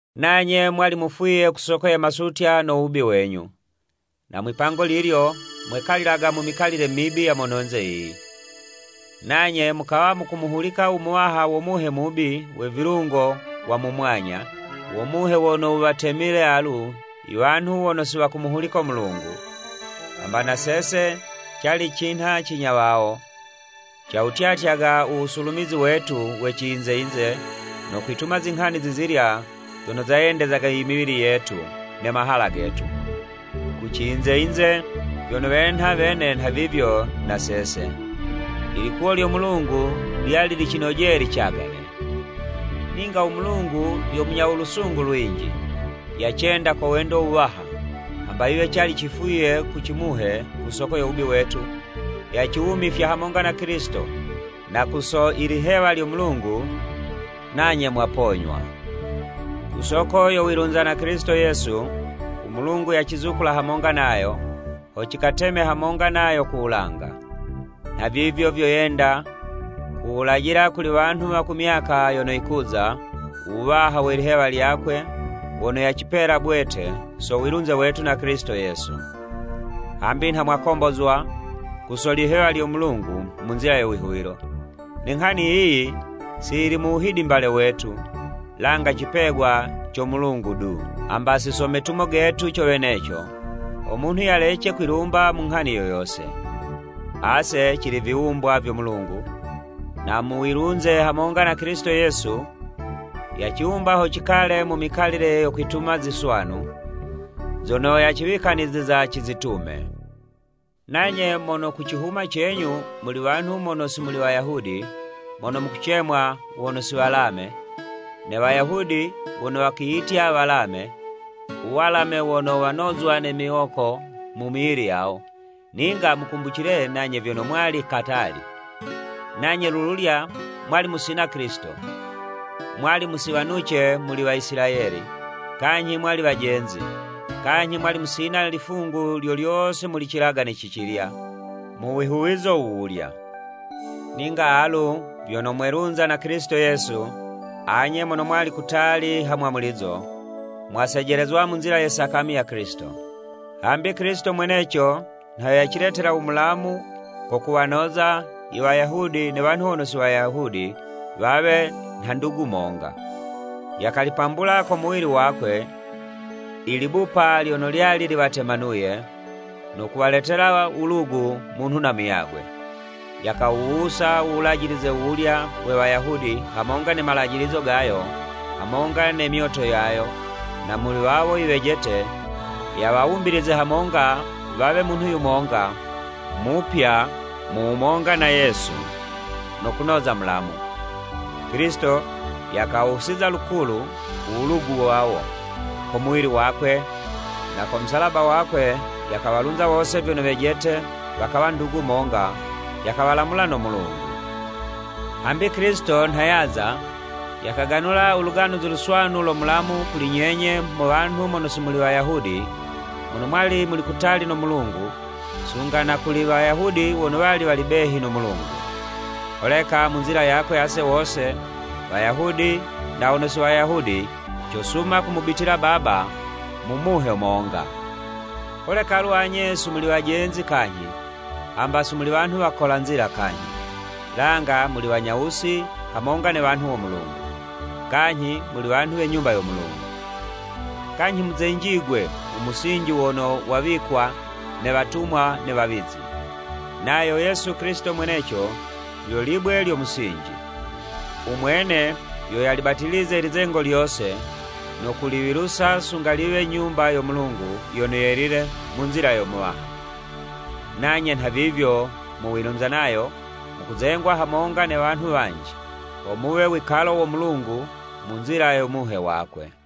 Nanye mwali mufwiye ku soko ye masutya no wubi wenyu. Na mwipango lilyo mwekalilaga mu mikalile mibi ya mononze yiyi, nanye mukawa mukumuhulika u muwaha wo muhe mubi we vilungo wa mu mwanya, wo muhe wono wuwatemile alu, iwanhu wono si wakumuhulika u Mulungu. Hamba na sese cali cinha cinya wawo, cawutyatyaga u wusulumizi wetu we ciyinze yinze, no kwituma zinghani zizilya zono zayendezaga imiwili yetu ne mahala getu, kuciyinze yinze, vyono wenha wene nhavivyo na sese, ilikuwo lyo Mulungu lyali licinojeye licagane. Ninga u Mulungu yo munya u lusungu lwinji. Yacenda ko wendo wuwaha, hamba yiwe cali cifwiye ku cimuhe ku soko yo wubi wetu, yaciwumifya hamonga na Kilisito. Na ku so ilihewa lyo Mulungu, nanye mwaponywa. Ku soko yo wilunza na Kilisito, Yesu, u Mulungu yacizukula hamonga nayo, ho cikateme hamonga nayo ku wulanga. Nhavivyo vyo yenda kuwulajila kuli wanhu wa ku myaka yono yokuza, u wuwaha we lihewa lyakwe wono yacipela bwete so wilunze wetu na Kilisito Yesu. Hambi nha mwakombozwa ku so lihewa lyo Mulungu mu nzila yo wihuwilo. Ne nghani yiyi si yili mu wuhidimbale wetu, langa cipegwa co Mulungu du. Hamba si so metumo getu co weneco, ho munhu yalece kwilumba mu nghani yo yose. Ase cili viwumbwa vyo Mulungu, na mu wilunze hamonga na Kilisito Yesu, yaciwumba ho cikale mu mikalile yo kwituma ziswanu, zono yaciwikaniziza cizitume. Nanye mono ku cihuma cenyu, muli wanhu mono si muli Wayahudi, mono mukucemwa, “Wono si mwalame” ne Wayahudi wono wakiyitya “Walame” u walame wono wanozwa ne miwoko mu miwili yawo, ninga mukumbucile nanye vyono mwali katali. Nanye lululya mwali mu musina Kilisito, mwali musiwanuce muli Waisilayeli, kanyhi mwali wejenzi, kanyhi mwali musina lifungu lyo lyose muli cilagane cicilya mu wihuwizo wuwulya. Ninga alu vyono mwelunza na Kilisito Yesu, anye mono mwali kutali ha mwamulizo, mwasejelezezwa mu nzila ye sakami ya Kilisito. Hambi Kilisito mweneco nha yo yaciletela u mulamu ko kuwanoza i Wayahudi ne wanhu wono si Wayahudi wawe nha ndugu monga. Yakalipambula ko muwili wakwe, i libupa lyono lyali liwatemanuye, no kuwaletela wulugu munhu na muyagwe. Yakawuwusa u Wulajilize wuwulya we Wayahudi hamonga ne malajilizo gayo hamonga ne myoto yayo, na muli wawo iwejete yawawumbilize hamonga wawe munhu yumonga mupya mu wumonga na Yesu, no kunoza mulamu. Kilisito yakawusiza lukulu u wulugu wawo, ko muwili wakwe, na ko musalaba wakwe yakawalunza wose vyono wejete wakawa ndugu monga, yakawalamula no Mulungu. Hambi Kilisito nha yaza, yakaganula u Luganuzi Luswanu lo mulamu kuli nyenye mo wanhu mono si muli Wayahudi mono mwali muli kutali no Mulungu, sunga na kuli Wayahudi wono wali wali behi no Mulungu. Holeka mu nzila yakwe ase wose, Wayahudi na wono si Wayahudi, cosuma kumubitila Baba mu Muhe monga. Holeka alu anye si muli wajenzi kanyhi, hamba si muli wanhu wakola nzila kanyhi, langa muli Wanyawusi hamonga ne wanhu wo Mulungu, kanyhi muli wanhu we Nyumba yo Mulungu. Kanyhi muzenjigwe mu musinji wono wawikwa ne watumwa ne wawizi, nayo Yesu Kilisito mweneco lyo libwe lyo musinji. U mwene yo yalibatilize ilizengo lyose no kuliwilusa sunga liwe Nyumba yo Mulungu yono yelile mu nzila yo Muwaha. Nanye nhavivyo mu wilunza nayo, mukuzengwa hamonga ne wanhu wanji, ho muwe wikalo wo Mulungu mu nzila yo Muhe wakwe.